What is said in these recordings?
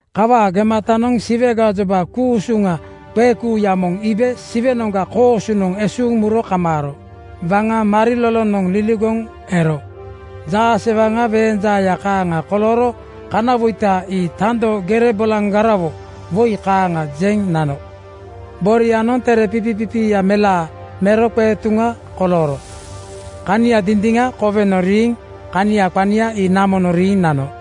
Kawaa gematanoŋ Siwe gajoba ku-usuŋa qeekuuya moŋ iibe Siwenoŋga koosunoŋ esuuŋ muro kamaaro. Waŋa marilolonoŋ liligoŋ ero. Jaasewaŋa weeŋ jaaya kaaŋa kolooro kanawoita ii tando gere bolaŋgarawo woi kaaŋa jeŋ nano. Borianoŋ tere pipipipiiya melaa mero qeetuŋa kolooro. Kania dindiŋa kowenoŋ riiŋ kania qania ii namonoŋ riiŋ nano.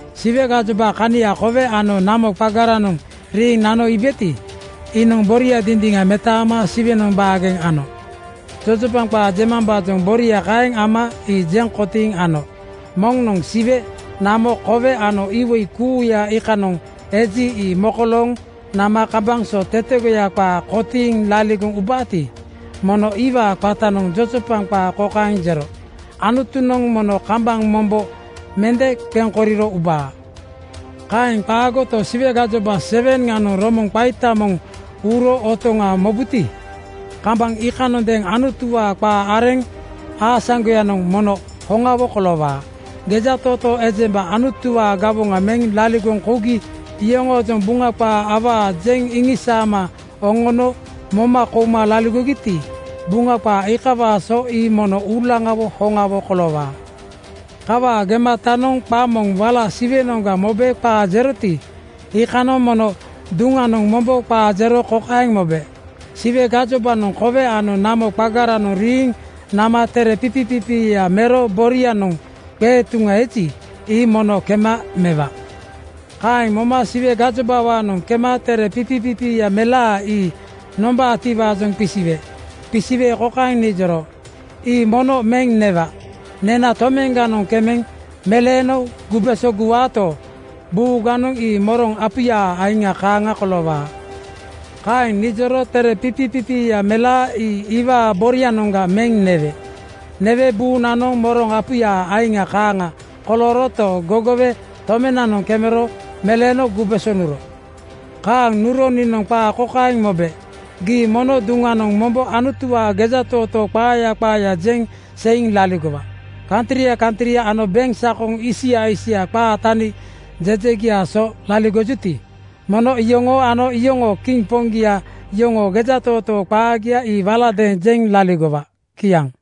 Siwe gajoba kania kowe ano namo qagaranoŋ riiŋ nano iibeti, iinoŋ boria dindiŋa metaama Siwenoŋ baageŋ ano. Jojopaŋ qaa jemambaajoŋ boria kaeŋ ama ii jeŋ kotiiŋ ano. Moŋnoŋ Siwe, namo, kowe ano iwoi kuuya iikanoŋ eji, ii mokolooŋ nama kambaŋ so tetegoya qaa kotiiŋ laligoŋ ubaati, mono iwaa qatanoŋ jojopaŋ qaa kokaeŋ jero, “Anutunoŋ mono kambaŋ mombo mende qeŋ koriro ubaa. Kaeŋ qaagoto, Siwe gajoba 7:ŋanoŋ romoŋa qaita moŋ (biugel) uuro otoŋa mobuti, kambaŋ iikanondeeŋ Anutuwaa qaa areŋ aasaŋgoyanoŋ mono hoŋawo koloowaa. Gejatootoo ejemba Anutuwaa gawoŋa meŋ laligoŋ kougi yoŋoojoŋ Buŋa qaaya awaa jeŋ iŋisaama oŋono moma kouma laligogiti, Buŋa qaa iikawaa so ii mono uulaŋawo hoŋawo koloowaa.” Kawaa gematanoŋ qa moŋ wala Siwenoŋga mobe qaa jeroti, iikanoŋ mono duŋanoŋ mombo qaa jero kokaeŋ mobe, “Siwe gajobanoŋ kowe ano namo qagaranoŋ riiŋ nama tere pipipipiiya mero borianoŋ qeetuŋa eji, ii mono kema mewa.” Kaeŋ moma Siwe gajobawaanoŋ kema tere pipipipiiya melaa ii nombaatiwaajoŋ qisiwe. Qisiwe kokaeŋ nijoro, “Ii mono meŋ newa. Nena tomeŋganoŋ kemeŋ meleeno gubeso guwaato, buuganoŋ ii moroŋ apuyaa aiŋa kaaŋa koloowaa.” Kaeŋ nijoro tere pipipipiiya melaa ii iwaa boronoŋga meŋ newe. Newe buunanoŋ moroŋ apuyaa aiŋa kaaŋa kolooroto, gogowe tomenanoŋ kemero meleeno gubeso nuro. Kaaŋ nuro niinoŋ qaa kokaeŋ mobe, “Gii mono duŋanoŋ mombo Anutuwaa gejatootoo qaaya qaaya jeŋ seiŋ laligowa. Kantria kantria ano beŋsakoŋ isia isia qaa tani jejegiaa so laligojuti, mono iyoŋoo ano iyoŋoo kiŋ poŋgia yoŋoo gejatootoo qaagia ii waladeeŋ jeŋ laligowa.” Kiaŋ.